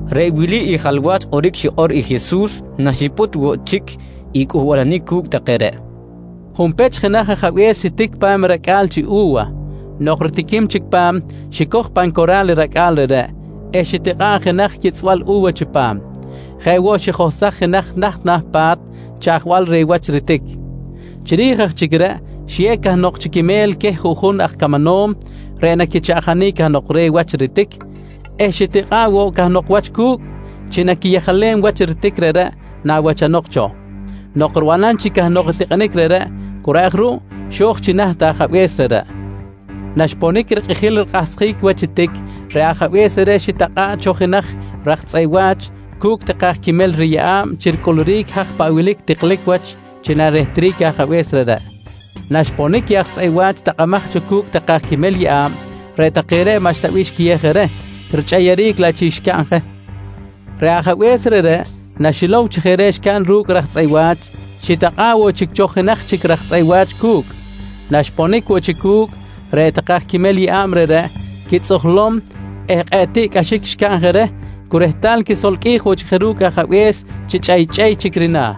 Reꞌ wili i jalwach kꞌoric xikꞌor i Jesus naxipꞌut woꞌ chic i cꞌuhbalanic cu̱cꞌ take reꞌ: «Junpech jenaj ajabe̱s xitic pa̱m i racꞌa̱l chi u̱wa. Nok ritiquim chic pa̱m, xicoj pan cora̱l i racꞌa̱l reꞌreꞌ eh xitikꞌa̱ꞌ jenaj yitzꞌbal u̱wa chipam. Jeꞌ woꞌ xijohsaj jenaj naht na̱ pa̱t chaꞌjbal reh wach ritic. Chiri̱j aj chic reꞌ xiyew cahnok chi quimel queh juꞌjun aj camanom reꞌ naquichaꞌjanic cahnok reh wach ritic eh xitikꞌa̱ꞌ woꞌ cahnok wach cu̱cꞌ chi naquiyejalem wach i ritic reꞌreꞌ nawachanok cho. Nok ribanam chic cahnok i tikꞌinic reꞌreꞌ cu reꞌ aj ruꞌ xo̱j chi naht i ajabe̱s reꞌreꞌ. Naxponic rikꞌijil rikꞌahsjic wach i tic, reꞌ ajabe̱s reꞌreꞌ xitakꞌa̱ꞌ cho jenaj raj tzꞌeꞌ wa̱ch cu̱cꞌ take aj quimel riyeꞌa̱b chi ricꞌuluric i haj paꞌ wilic i tiklic wach chi narehtric i ajabe̱s reꞌreꞌ. Naxponic i aj tzꞌeꞌ wa̱ch takꞌamaj cho cu̱cꞌ take aj quimel yeꞌa̱b, reꞌ take reꞌ maꞌxta bih xquiyew je reh, richꞌeyeric laꞌ chic xcaꞌn je. Reꞌ ajabe̱s reꞌreꞌ naxilow chi jeꞌ reꞌ xcaꞌn ru̱cꞌ i raj tzꞌeꞌ wa̱ch, xitakꞌa̱ꞌ woꞌ chic cho jenaj chic raj tzꞌeꞌ wa̱ch cu̱cꞌ. Naxponic woꞌ chic cu̱cꞌ, reꞌ take aj quimel yeꞌa̱b reꞌreꞌ xquitzꞌujlom eh kꞌe̱ꞌ tiꞌcꞌaxic xcaꞌn reh cu rehtal xquisolqꞌuij woꞌ chic je ru̱cꞌ ajabe̱s chi chꞌeychꞌey chic rina̱.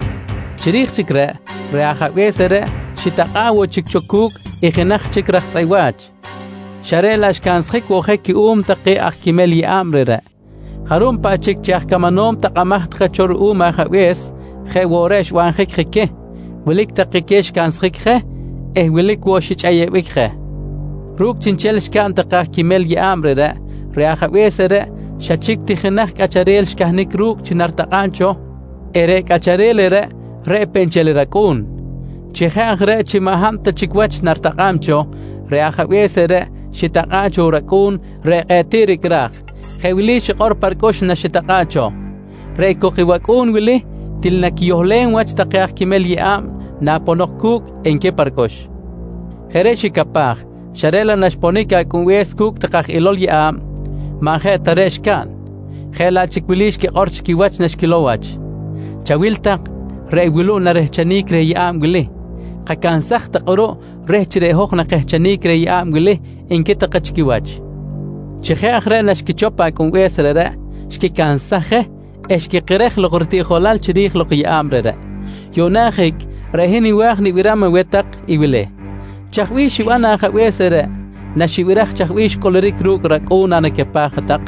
Chiri̱j chic reꞌ, reꞌ ajabe̱s reꞌreꞌ xitakꞌa̱ꞌ woꞌ chic cho cu̱cꞌ i jenaj chic raj tzꞌeꞌ wa̱ch, xa reꞌ laꞌ xcansjic woꞌ je cuꞌum take aj quimel yeꞌa̱b reꞌreꞌ. Jarub paꞌ chic chi aj camanom takꞌamaj take cho ruꞌum ajabe̱s, jeꞌ woꞌ reꞌ xbanjic je queh. Wilic take queh xicansjic je eh wilic woꞌ xichꞌeyebic je. «Ru̱cꞌ chiꞌnchel xcaꞌn take aj quimel yeꞌa̱b reꞌreꞌ, reꞌ ajabe̱s reꞌreꞌ xa chic ti jenaj cꞌacharel xcahnic ru̱cꞌ chi naritakꞌa̱b cho eh reꞌ cꞌacharel reꞌreꞌ, reꞌ peꞌ nchel i racꞌu̱n. Chi jeꞌ aj reꞌ chi maꞌ hab ta chic wach naritakꞌa̱b cho, reꞌ ajabe̱s reꞌreꞌ xitakꞌa̱ꞌ cho racꞌu̱n reꞌ kꞌe̱ꞌ tiꞌ ricꞌraj. Jeꞌ wili xikꞌor pa ricꞌux naxitakꞌa̱ꞌ cho: ‹Reꞌ cok i wacꞌu̱n wili til naquiyohlem wach take aj quimel yeꞌa̱b naponok cu̱cꞌ, nqui pa ricꞌux. «Jeꞌ reꞌ xicapaj xa reꞌ laꞌ naxponic i acꞌunbe̱s cu̱cꞌ take aj ilol yeꞌa̱b, maꞌ jeꞌ ta reꞌ xcaꞌn, jeꞌ laꞌ chic wili xquikꞌor chi quiwach naxquilow wach: ‹Chawil tak, reꞌ wuluꞌ narehchenic reh yeꞌa̱b wili. Kacansaj tak kꞌuruꞌ reh chi reꞌ hoj nakehchenic reh yeꞌa̱b wili, nqui take chi quiwach. «Chi jeꞌ aj reꞌ naxquichop i acꞌunbe̱s reꞌreꞌ, xquicansaj je eh xquikerej lok ritiꞌjolal chiri̱j lok i yeꞌa̱b reꞌreꞌ. Yuꞌna ajic, reꞌ hin nwa̱j nibiram aweh tak i wili: Chaj bih xiban i ajabe̱s reꞌreꞌ naxibiraj chaj bih xcꞌuluric ru̱cꞌ racꞌu̱n nanacapaj hat-tak?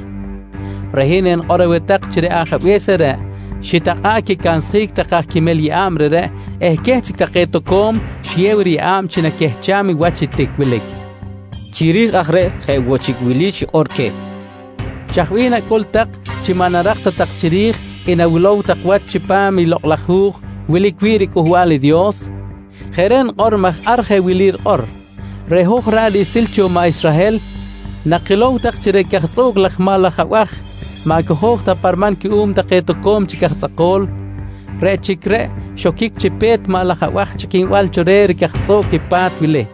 Reꞌ hin enikꞌor aweh tak chi reꞌ ajabe̱s reꞌreꞌ xitakꞌa̱ꞌ quicansjic take aj quimel yeꞌa̱b reꞌreꞌ eh queh chic take toco̱m xiyew riyeꞌa̱b chi naquehcham i wach i tic wilic? nqui Jesus queh. Chiri̱j aj reꞌ, je woꞌ chic wili xikꞌor queh: «Chaj bih nacꞌul tak chi maꞌ narak ta tak chiri̱j i nawilow tak wach chipam i lokꞌ laj hu̱j wilic wi̱ꞌ riCꞌuhbal i Dios? Jeꞌ reꞌ nikꞌor maj ar jeꞌ wili rikꞌor: “Reꞌ hoj ra̱ꞌ riꞌsil cho maꞌ Israhel nakilow tak chi reꞌ cajtzꞌuꞌc laj maꞌ laj abaj maꞌ cojo̱j ta pa riman cuꞌum take toco̱m chic aj tzꞌako̱l, reꞌ chic reꞌ xoquic chi pe̱t maꞌ laj abaj chꞌiquinbal cho reh ricajtzꞌuꞌc i pa̱t wili,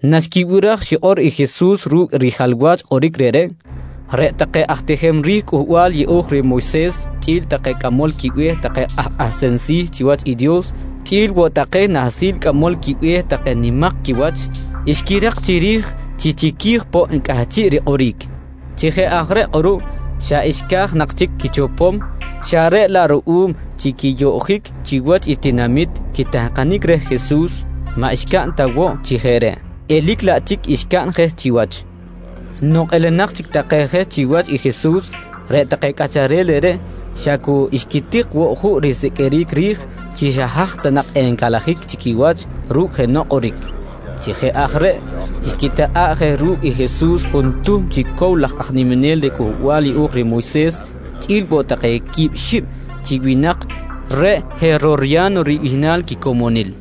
Naxquibiraj xikꞌor i Jesus ru̱cꞌ i rijalwach kꞌoric reꞌreꞌ, reꞌ take aj tijem ri̱j Cꞌuhbal Yeꞌo̱j reh Moyses chꞌi̱l take cꞌamol quibe̱h take aj kꞌahsem si̱ chiwach i Dios chꞌi̱l woꞌ take nahsil cꞌamol quibe̱h take nimak quiwach, xquirak chiri̱j chi chiqui̱j poꞌ cꞌahchiꞌ rikꞌoric. Chi jeꞌ aj reꞌ kꞌuruꞌ, xa xca̱j nak chic quichopom xa reꞌ laꞌ ruꞌum chi quiyoꞌjic chiwach i tinamit quitahkanic reh Jesus maꞌ xcaꞌn ta woꞌ chi jeꞌ reꞌ, elic laꞌ chic xcaꞌn je chiwach. Nok elenak chic take je chiwach i Jesus, reꞌ take cꞌacharel reꞌreꞌ xa cu xquitik woꞌ juꞌ risiqꞌuiric ri̱j chi haj ta nak encalajic chi quiwach ru̱cꞌ jenoꞌ kꞌoric. Chi jeꞌ aj reꞌ, xquitakꞌa̱ꞌ je ru̱cꞌ i Jesus juntuhm chi cow laj aj niminel reh Cꞌuhbal Yeꞌo̱j reh Moyses chꞌi̱l woꞌ take quib xib chi winak reꞌ Herorya̱no ribihnal quicomonil.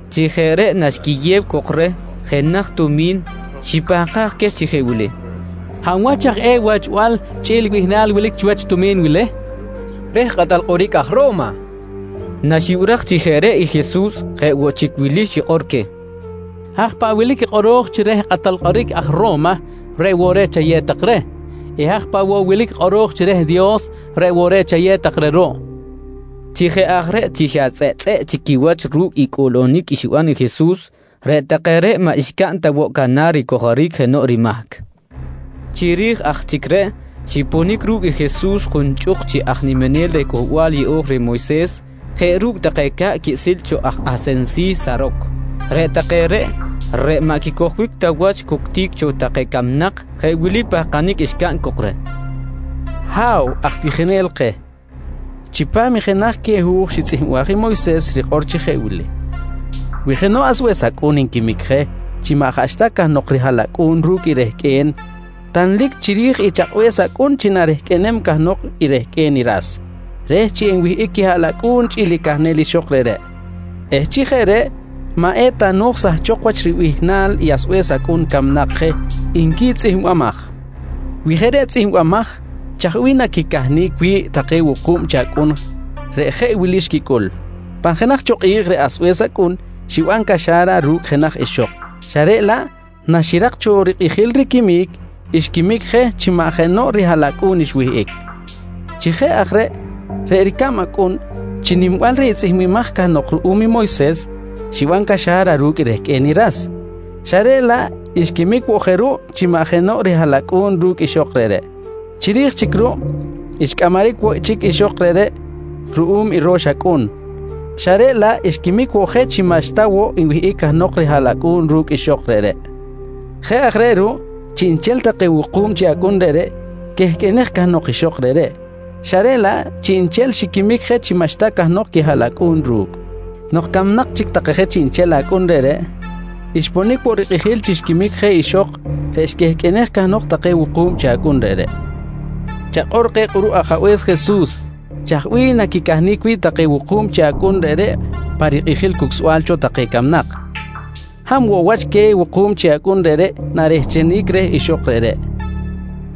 Chi jeꞌ reꞌ naxquiyew cok reh jenaj tumi̱n, xipahkaj queh chi jeꞌ wili: «Hab wach aj eh i wachbal chꞌi̱l i bihnal wilic chiwach i tumi̱n wili? nqui queh. —Reh kꞌatal kꞌoric aj Ro̱ma, nqui take reh. Naxibiraj chi jeꞌ reꞌ i Jesus, jeꞌ woꞌ chic wili xikꞌor queh: «Haj paꞌ wilic i kꞌoro̱j chi reh i kꞌatal kꞌoric aj Ro̱ma, reꞌ woꞌ reꞌ chayew tak reh eh haj paꞌ woꞌ wilic i kꞌoro̱j chi reh i Dios, reꞌ woꞌ reꞌ chayew tak reh ruꞌ, nqui queh. Chi jeꞌ aj reꞌ chi xa tzꞌeꞌtzꞌeꞌ chic quiwach ru̱cꞌ i cꞌuꞌlunic xiban i Jesus, reꞌ take reꞌ maꞌ xcaꞌn ta woꞌ canar ricojoric jenoꞌ rimahc. Chiri̱j aj chic reꞌ, xiponic ru̱cꞌ i Jesus junchꞌuk chic aj niminel reh Cꞌuhbal Yeꞌo̱j reh Moyses jeꞌ ru̱cꞌ take ca̱ꞌ quiꞌsil cho aj kꞌahsem si̱ Saroc. Reꞌ take reꞌ, reꞌ maꞌ quicojbic ta wach cuctic cho take camnak, jeꞌ wili pahkanic xcaꞌn cok reh: «Ha̱w aj tijinel keh, chipam jenaj queh hu̱j xitzꞌihmbaj i Moyses rikꞌor chi jeꞌ wili: “Wi jenoꞌ asbe̱s acꞌun nquimic je chi maꞌ jaꞌxta cahnok rihaꞌlacꞌu̱n ru̱cꞌ i rehqꞌue̱n, tanlic chiri̱j i chakꞌbe̱s acꞌun chi narehqꞌuenem cahnok rehqꞌue̱n i ras reh chi enwihꞌic quihaꞌlacꞌu̱n chꞌi̱l i cahnel ixok reꞌreꞌ eh chi jeꞌ reꞌ maꞌ eta no̱j sahchok wach ribihnal i asbe̱s acꞌun camnak je, nqui tzꞌihmbimaj. «Wi jeꞌ reꞌ tzꞌihmbimaj chaj bih naquicahnic wi̱ꞌ take wuku̱b chi acꞌun reꞌ jeꞌ wili xquicꞌul? Pan jenaj cho kꞌi̱j reꞌ asbe̱s acꞌun xiban caxa̱ra ru̱cꞌ jenaj ixok xa reꞌ laꞌ naxirak cho rikꞌijil riquimic, xquimic je chi maꞌ jenoꞌ rihaꞌlacꞌu̱n xwihꞌic. Chi jeꞌ aj reꞌ, reꞌ ricab acꞌun chi nimbal reh i tzꞌihmbimaj cahnok ruꞌum i Moyses, xiban caxa̱ra ru̱cꞌ rehqꞌue̱n i ras, xa reꞌ laꞌ xquimic woꞌ je ruꞌ chi maꞌ jenoꞌ rihaꞌlacꞌu̱n ru̱cꞌ ixok reꞌreꞌ. Chiri̱j chic ruꞌ, xcꞌamaric woꞌ chic ixok reꞌreꞌ ruꞌum i ro̱x acꞌun, xa reꞌ laꞌ xquimic woꞌ je chi maꞌxta woꞌ nwihꞌic cahnok rihaꞌlacꞌu̱n ru̱cꞌ ixok reꞌreꞌ. Jeꞌ aj reꞌ ruꞌ, chiꞌnchel take wuku̱b chi acꞌun reꞌreꞌ quehqꞌuenej cahnok ixok reꞌreꞌ, xa reꞌ laꞌ chiꞌnchel xiquimic je chi maꞌxta cahnok quihaꞌlacꞌu̱n ru̱cꞌ. Nok camnak chic take je chiꞌnchel chi acꞌun reꞌreꞌ, xponic woꞌ rikꞌijil chi xquimic je ixok reꞌ xquehqꞌuenej cahnok take wuku̱b chi acꞌun reꞌreꞌ. Chakꞌor keh kꞌuruꞌ ajabe̱s Jesus, chaj bih naquicahnic wi̱ꞌ take wuku̱b chi acꞌun reꞌreꞌ pa rikꞌijil cucsbal cho take camnak? Hab woꞌ wach queh wuku̱b chi acꞌun reꞌreꞌ narehchenic reh ixok reꞌreꞌ?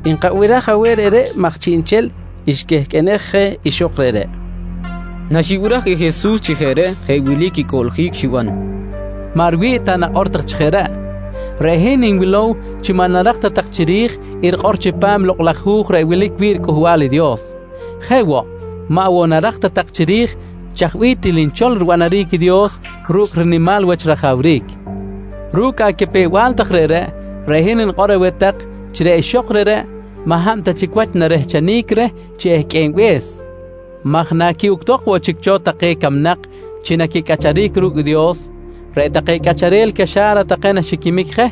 Nkabiraj aweh reꞌreꞌ maj chiꞌnchel xquehqꞌuenej je ixok reꞌreꞌ, nqui take cok reh. Naxibiraj i Jesus chi jeꞌ reꞌ, jeꞌ wili quicꞌuꞌljic xiban: «Maꞌ riwi̱ꞌ ta nakꞌor tak chi jeꞌ reꞌ. Reꞌ hin nwilow chi maꞌ narak ta tak chiri̱j i rikꞌor chipam i Lokꞌ laj Hu̱j reꞌ wilic wi̱ꞌ riCꞌuhbal i Dios. Jeꞌ woꞌ, maꞌ woꞌ narak ta tak chiri̱j chaj bih til nchol ribanaric i Dios ru̱cꞌ rinimal wach rajawric. Ru̱cꞌ acapew-bal tak reꞌreꞌ, reꞌ hin nikꞌor aweh tak chi reꞌ ixok reꞌreꞌ maꞌ hab ta wach narehchenic reh chi ehqꞌuenbe̱s maj naquiꞌuctok woꞌ chic cho take camnak chi naquicꞌacharic ru̱cꞌ i Dios, reꞌ take cꞌacharel caxa̱ra take naxiquimic je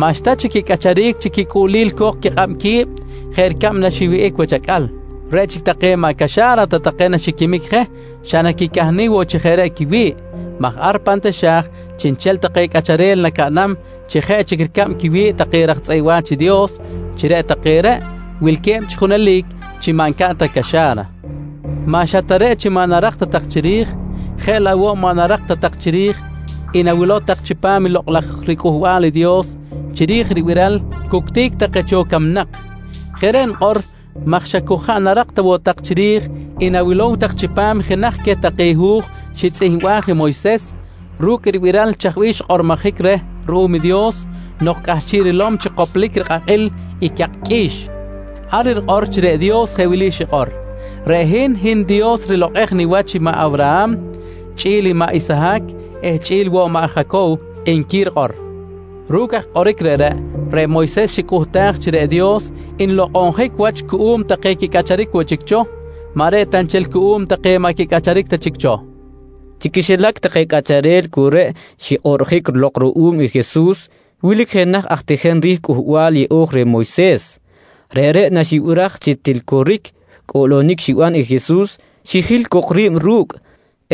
maꞌxta chic quicꞌacharic chi quicꞌuꞌlil co̱k quikꞌab qui̱b jeꞌ ricab naxiwihꞌic wach acꞌal. Reꞌ chic take maꞌ caxa̱ra ta take naxiquimic je xa naquicahnic woꞌ chi jeꞌ reꞌ quiwi̱ꞌ maj ar pan taxa̱j chiꞌnchel take cꞌacharel nacaꞌnam chi jeꞌ chic ricab quiwi̱ꞌ take raj tzꞌeꞌ wa̱ch i Dios chi reꞌ take reꞌ wilque̱b chi junelic chi maꞌ ncaꞌn ta caxa̱ra. «Maꞌ xa ta reꞌ chi maꞌ narak ta tak chiri̱j, jeꞌ laꞌ woꞌ maꞌ narak ta tak chiri̱j i nawilow tak chipam i Lokꞌ laj riCꞌuhbal i Dios chiri̱j ribiral cuctic take cho camnak. Jeꞌ reꞌ nikꞌor maj xa cu jaꞌ narak ta woꞌ tak chiri̱j i nawilom tak chipam jenaj queh take hu̱j xitzꞌihmbaj i Moyses ru̱cꞌ ribiral chaj bih xkꞌormojic reh ruꞌum i Dios nok cꞌahchiꞌ rilom chi koplic i rikꞌakꞌil i cak qꞌui̱x. Ar rikꞌor chi reꞌ Dios jeꞌ wili xikꞌor: “Reꞌ hin, hin i Dios rilokꞌej niwach i maꞌ Awraham chꞌi̱l i maꞌ Isahac eh chꞌi̱l woꞌ i maꞌ Jacow, nqui rikꞌor. «Ru̱cꞌ aj kꞌoric reꞌreꞌ, reꞌ Moyses xicꞌuhtaj chi reꞌ Dios nlokꞌonjic wach cuꞌum take quicꞌacharic woꞌ chic cho, maꞌ reꞌ ta nchel cuꞌum take maꞌ quicꞌacharic ta chic cho, nqui Jesus queh. Chi quixilac take cꞌacharel cu reꞌ xikꞌoꞌrjic lok ruꞌum i Jesus, wilic jenaj aj tijem ri̱j Cꞌuhbal Yeꞌo̱j reh Moyses. Reꞌreꞌ naxibiraj chi til coric cꞌuꞌlunic xiban i Jesus, xijil cok ri̱b ru̱cꞌ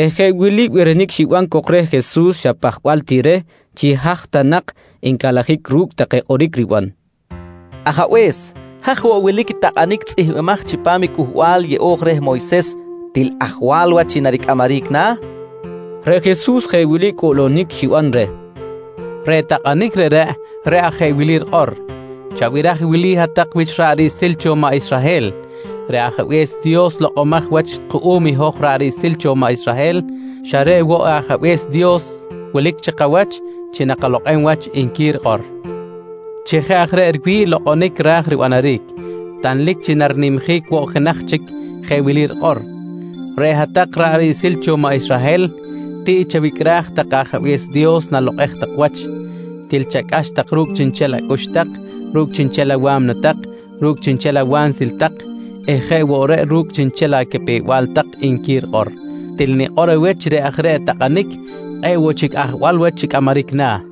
eh jeꞌ wili birinic xiban cok reh Jesus xa pajbal ti reh chi haj ta nak encalajic ru̱cꞌ take kꞌoric riban: «Ajabe̱s, haj woꞌ wilic i takꞌanic tzꞌihmbimaj chipam i Cꞌuhbal Yeꞌo̱j reh Moyses til ajwal wach chi naricꞌamaric na̱, nqui reh. Reꞌ Jesus jeꞌ wili cꞌuꞌlunic xiban reh: «Reꞌ takꞌanic reꞌreꞌ, reꞌ aj i jeꞌ wili rikꞌor: “Chabiraj i wili hat-tak wich ra̱ꞌ riꞌsil cho maꞌ Israhel: Reꞌ Ajabe̱s Dios lokꞌomaj wach kuꞌum i hoj ra̱ꞌ riꞌsil cho maꞌ Israhel, xa reꞌ woꞌ i Ajabe̱s Dios wilic chi kawach chi nakalokꞌem wach, nqui rikꞌor. «Chi jeꞌ aj reꞌ riwi̱ꞌ i lokꞌonic ra̱j ribanaric, tanlic chi narinimjic woꞌ i jenaj chic jeꞌ wili rikꞌor: “Reꞌ hat-tak ra̱ꞌ riꞌsil cho maꞌ Israhel tiꞌ chawicꞌraj tak i Ajabe̱s Dios nalokꞌej tak wach. Til chacꞌax tak ru̱cꞌ chiꞌnchel acꞌux tak, ru̱cꞌ chiꞌnchel awa̱mna tak, ru̱cꞌ chiꞌnchel awansil tak eh jeꞌ woꞌ reꞌ ru̱cꞌ chiꞌnchel acapew-bal tak, nqui rikꞌor. «Til nikꞌor aweh chi reꞌ aj reꞌ i takꞌanic kꞌe̱ꞌ woꞌ chic ajwal wach chi cꞌamaric na̱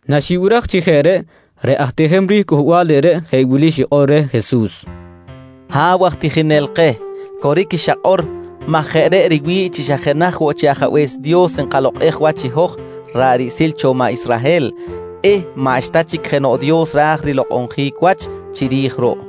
Naxibiraj chi jeꞌ reꞌ, reꞌ aj tijem ri̱j cꞌuhbal reꞌreꞌ jeꞌ wili xikꞌor reh Jesus: «Ha̱w aj tijinel keh, coric i xakꞌor maj jeꞌ reꞌ riwi̱ꞌ chi xa jenaj woꞌ chi Ajabe̱s Dios nkalokꞌej wach i hoj ra̱ꞌ riꞌsil cho maꞌ Israhel eh maꞌxta chic jenoꞌ Dios ra̱j lokꞌonjic wach chiri̱j ruꞌ.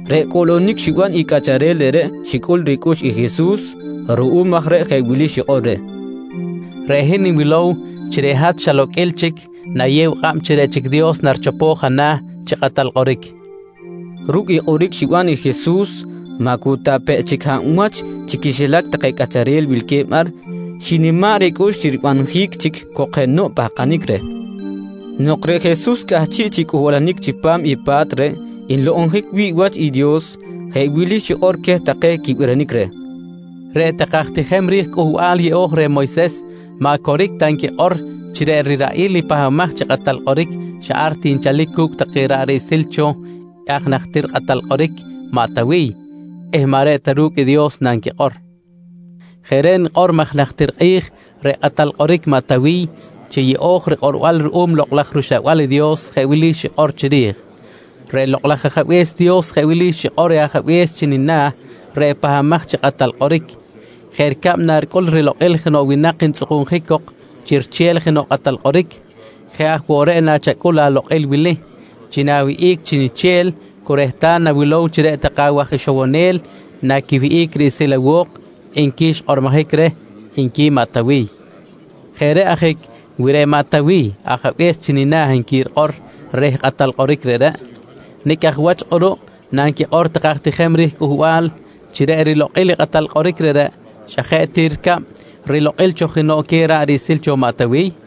Reꞌ cꞌuꞌlunic xiban i cꞌacharel reꞌreꞌ xicꞌul ricꞌux i Jesus. Ruꞌum aj reꞌ jeꞌ wili xikꞌor reh: «Reꞌ hin nwilow chi reꞌ hat xa loqꞌuil chic nayew kꞌab chi reꞌ chic i Dios richop ana̱ chi kꞌatal kꞌoric, nqui Jesus reh. Ru̱cꞌ i kꞌoric xiban i Jesus, maꞌ cu ta pe chic hab wach chi quixilac take cꞌacharel wilque̱b ar xinima̱ꞌ ricꞌux chi ribanjic chic cok jenoꞌ pahkanic reh. Nok reꞌ Jesus cꞌahchiꞌ chi cꞌuhbalanic chipam i pa̱t reꞌ nlokꞌonjic wi̱ꞌ wach i Dios, jeꞌ wili xikꞌor queh take quibirinic reh: «Reꞌ take aj tijem ri̱j Cꞌuhbal Yeꞌo̱j reh Moyses maꞌ coric ta nquikꞌor chi reꞌ riraꞌil i Pahbamaj chi Kꞌatal Kꞌoric xa ar ti nchalic cu̱cꞌ take ra̱ꞌ riꞌsil cho i aj najtir kꞌatal kꞌoric maꞌ Tawiy eh maꞌ reꞌ ta ru̱cꞌ i Dios nanquikꞌor. Jeꞌ reꞌ nikꞌor maj najtir kꞌi̱j reꞌ kꞌatal kꞌoric maꞌ Tawiy chi yeꞌo̱j rikꞌorbal ruꞌum i Lokꞌ laj rUxlabal i Dios jeꞌ wili xikꞌor chiri̱j: “Reꞌ Lokꞌ laj Ajabe̱s Dios jeꞌ wili xikꞌor reh Ajabe̱s chi nina̱ reꞌ Pahbamaj chi Kꞌatal Kꞌoric: ‘Jeꞌ ricab naricꞌul rilokꞌil jenoꞌ winak ntzꞌukunjic cok chi riche̱l jenoꞌ kꞌatal kꞌoric, jeꞌ aj woꞌ reꞌ nachacꞌul alokꞌil wili: Chi na̱wihꞌic chiniche̱l cu rehtal nawilow chi reꞌ take awaj ixowonel naquiwihꞌic riꞌsil awo̱k, nqui xkꞌormojic reh, nqui maꞌ Tawiy. «Jeꞌ reꞌ ajic wi reꞌ maꞌ Tawiy Ajabe̱s chi nina̱ nqui rikꞌor reh kꞌatal kꞌoric reꞌreꞌ, nicꞌ aj wach kꞌuruꞌ nanquikꞌor take aj tijem ri̱j cꞌuhbal chi reꞌ rilokꞌil i kꞌatal kꞌoric reꞌreꞌ, xa jeꞌ ti ricab rilokꞌil cho jenoꞌ queh ra̱ꞌ riꞌsil cho maꞌ Tawiy? nqui Jesus.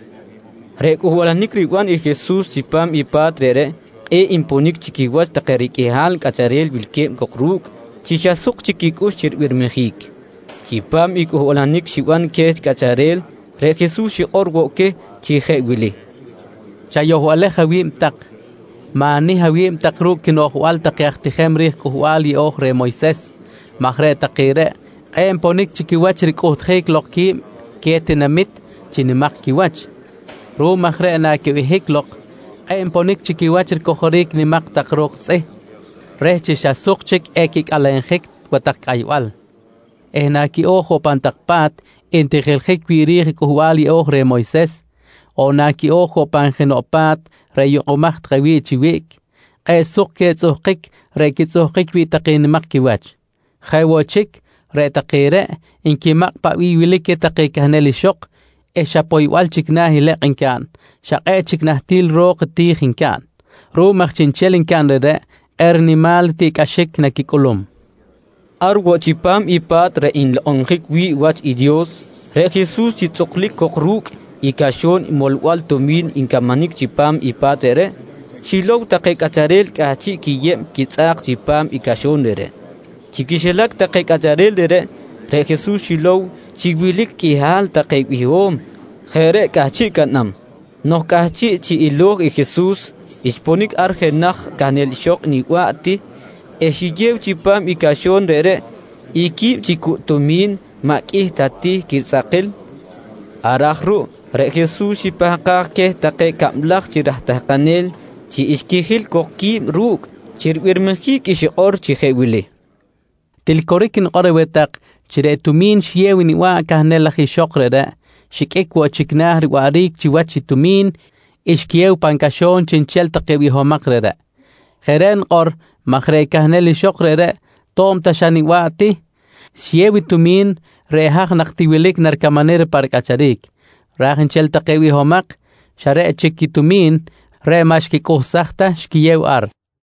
Reꞌ cꞌuhbalanic riban i Jesus chipam i pa̱t reꞌreꞌ kꞌe̱ꞌ nponic chi quiwach take riqꞌuihal cꞌacharel wilque̱b cok ru̱cꞌ chi xa suk chic quicꞌux chi ribirmijic. Chipam i cꞌuhbalanic xiban queh cꞌacharel, reꞌ Jesus, xikꞌor woꞌ queh chi jeꞌ wili: «Chayohbalej awi̱b tak, ma̱nih awi̱b tak ru̱cꞌ quinoꞌjbal take aj tijem ri̱j Cꞌuhbal Yeꞌo̱j reh Moyses maj reꞌ take reꞌ kꞌe̱ꞌ nponic chi quiwach ricꞌuhtjic lok qui̱b queh tinamit chi nimak quiwach. Ruꞌum aj reꞌ, naquibehic lok kꞌe̱ꞌ nponic chi quiwach ricojoric nimak tak ro̱k tzꞌih reh chi xa suk chic equicꞌalenjic wa tak cꞌaybal. Eh naquiꞌo̱j woꞌ pan tak pa̱t ntijiljic wi̱ꞌ ri̱j Cꞌuhbal Yeꞌo̱j reh Moyses, on naquiꞌo̱j woꞌ pan jenoꞌ pa̱t reꞌ yukꞌumaj take wi̱ꞌ chi wiꞌc, kꞌe̱ꞌ suk queh tzꞌuhkic reꞌ quitzꞌuhkic wi̱ꞌ take nimak quiwach. Jeꞌ woꞌ chic, reꞌ take reꞌ nquimakꞌ paꞌ bih wilic queh take cahnel ixok eh xa poybal chic na̱ i lekꞌ ncaꞌn, xa kꞌe̱ꞌ chic nahtil ro̱k ti̱j ncaꞌn. Ruꞌum aj chiꞌnchel ncaꞌn reꞌreꞌ kꞌe̱ꞌ rinimal tiꞌcꞌaxic naquicꞌulum, nqui Jesus. Ar woꞌ chipam i pa̱t reꞌ nlokꞌonjic wi̱ꞌ wach i Dios, reꞌ Jesus chi tzꞌuklic cok ru̱cꞌ i caxo̱n molbal tumi̱n ncamanic chipam i pa̱t reꞌreꞌ, xilow take cꞌacharel cꞌahchiꞌ quiyeb quitzꞌa̱k chipam i caxo̱n reꞌreꞌ. Chi quixilac take cꞌacharel reꞌreꞌ, reꞌ Jesus xilow chi wilic qꞌuihal take biho̱m jeꞌ reꞌ cꞌahchiꞌ caꞌnam. Nok cꞌahchiꞌ chi ilo̱j i Jesus, xponic ar jenaj cahnel ixok niba̱ꞌ ti eh xiyew chipam i caxo̱n reꞌreꞌ i quib chi cucꞌ tumi̱n maꞌ qꞌuih ta ti quitzꞌakil. Ar aj ruꞌ, reꞌ Jesus xipahkaj queh take cablaj chi raj tahkanel chi xquijil cok qui̱b ru̱cꞌ chi ribirmijic i xikꞌor chi jeꞌ wili: «Til coric nikꞌor aweh tak chi reꞌ tumi̱n xiyew i niba̱ꞌ cahnel laj ixok reꞌreꞌ, xiqꞌuic woꞌ chic na̱ riwaꞌric chiwach i tumi̱n xquiyew pan caxo̱n chiꞌnchel take bihomak reꞌreꞌ. Jeꞌ reꞌ nikꞌor maj reꞌ cahnel ixok reꞌreꞌ to̱b ta xa niba̱ꞌ ti xiyew i tumi̱n reꞌ haj nak ti wilic naricamanic reh pa ricꞌacharic, ra̱j nchel take bihomak xa reꞌ chic i tumi̱n reꞌ maꞌ xquicꞌuhsaj ta xquiyew ar, nqui Jesus.